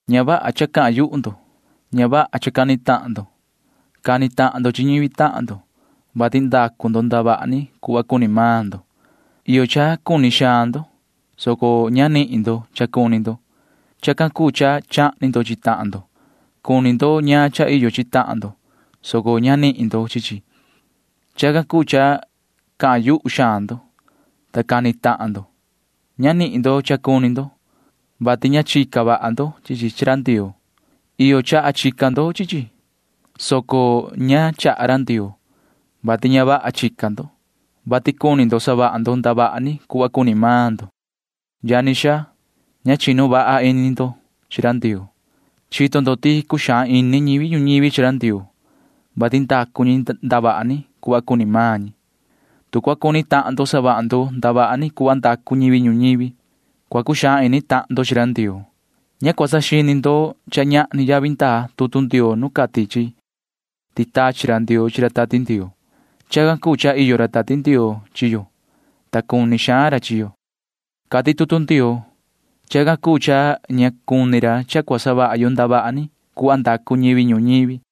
Ña vaha cha cahan yuhu ndo. Ña vaha cha cani tahan ndo. Cani tahan ndo chi ñivi tahan ndo, vati ndacu ndo ndavaha ni cuhva cuni maan ndo. Iyo cha cuni xaan ndo, soco ña nanihin ndo cha cuni ndo. Chacan cuu cha chahni ndo chi tahan ndo. Cuni ndo ñaan cha iyo chi tahan ndo, soco ña cuu nanihin ndo chi chi. Chacan cuu cha cahan yuhu xaan ndo, ta cani tahan ndo. Ña nanihin ndo cha cuni ndo, vati ña chica vaha ndo chi chi chi ra Ndioo. Iyo chaha chica ndo chi chi, soco ña chaha ra Ndioo, vati ña vaha chica ndo, vati cuni savaha ndo ndavaha ni cuhva cuni maan ndo. Yani xaa, ña chinu vaha ini ndo chi ra Ndioo. Chito ndo ti cuxaan ini ñivi ñuñivi chi ra Ndioo, vati ndacu ñi ndavaha ni cuhva cuni maan ñi. Tu cua cuni tahan ndo savaha ndo ndavaha ni cuhva ndacu ñivi ñuñivi, cua cuxaan ini tahan ndo chi ra Ndioo. Ña cua saxini ndo cha ñahni yavi ndaa tutu Ndioo nu cati chi ti tachi ra Ndioo chi ra Tati Ndioo. Chacan cuu cha iyo ra Tati Ndioo chi yo, ta cuni xaan ra chi yo, cati tutu Ndioo. Chacan cuu cha ña cuni ra cha cua savaha yo ndavaha ni cuhva ndacu ñivi ñuñivi.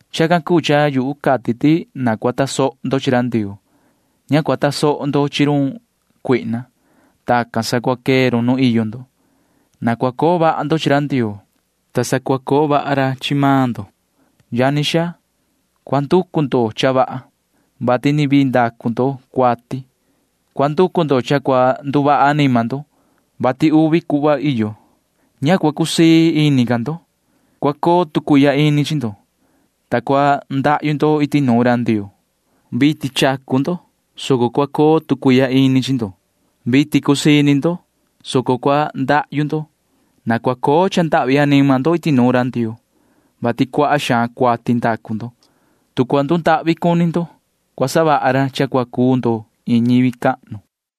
Chacan cuu cha yu cati ti na cua tasoho ndo chi ra Ndioo. Ña cua tasoho ndo chi run cuihna. Tacan sa cua quee run nu iyo ndo. Na cua coo vaha ndo chi ra Ndioo, ta sa cua coo vaha ra chi maan ndo. Yani xaa, cua nducu ndo cha vaha, vati ni vii ndacu ndo cuati. Cua nducu ndo cha cua nduvaha anima ndo, vati cha saxini xaan ndo. Na ña cua cusii ini ca ndo. Na cua coo tu cuihya ini chi ndo, ta na cua ndahyu ndo iti nuun ra Ndioo. Vitin chacu ndo, soco cua coo tu cuihya ini chi ndo. Vitin cusii ini ndo, soco cua ndahyu ndo. Na cua coo cha ndahvi anima ndo iti nuun ra Ndioo, vati cuaha xaan cuati ndacu ndo. Tu cua ndundahvi cuni ndo, cua savaha ra cha cua cuu ndo iin ñivi cahnu.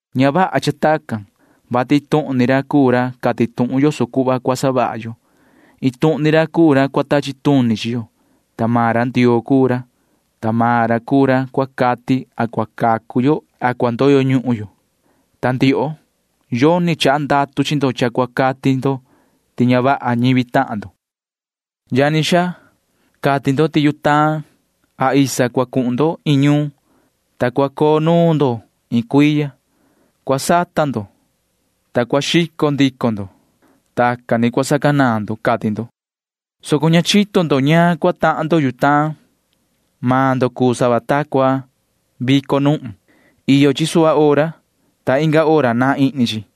Ña vaha cha tacan, vati iin tuhun ni ra cuu ra cati tuhun yoso cuhva cua savaha yo. Iin tuhun ni ra cuu ra cua tachi tuni chi yo. Maan ra Ndioo cuu ra, ta maan ra cuu ra cua cati a cua cacu yo a cua ndoyo ñuhun yo. Ta ndioho―yoni chaha ndatu chi ndo cha cua cati ndo ti ña vaha ñivi tahan ndo. Yani xaa, cati ndo ti yutaan isa cua cuhun ndo iin ñuun, ta cua coo nuun ndo iin cuiya. Cua sata ndo, ta cua xico ndico ndo. Tacan ni cua sacanaan ndo, cati ndo, soco ña chito ndo ñaan cua tahan ndo yutaan. Maan ndo cuu sava ta cua vico nuhun. Iyo chi suhva hora, ta inga hora naan ihni chi.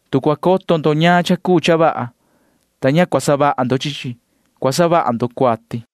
Tu cua coto ndo ñaan cha cuu cha vaha, ta ña cua savaha ndo chi chi, cua savaha ndo cuati.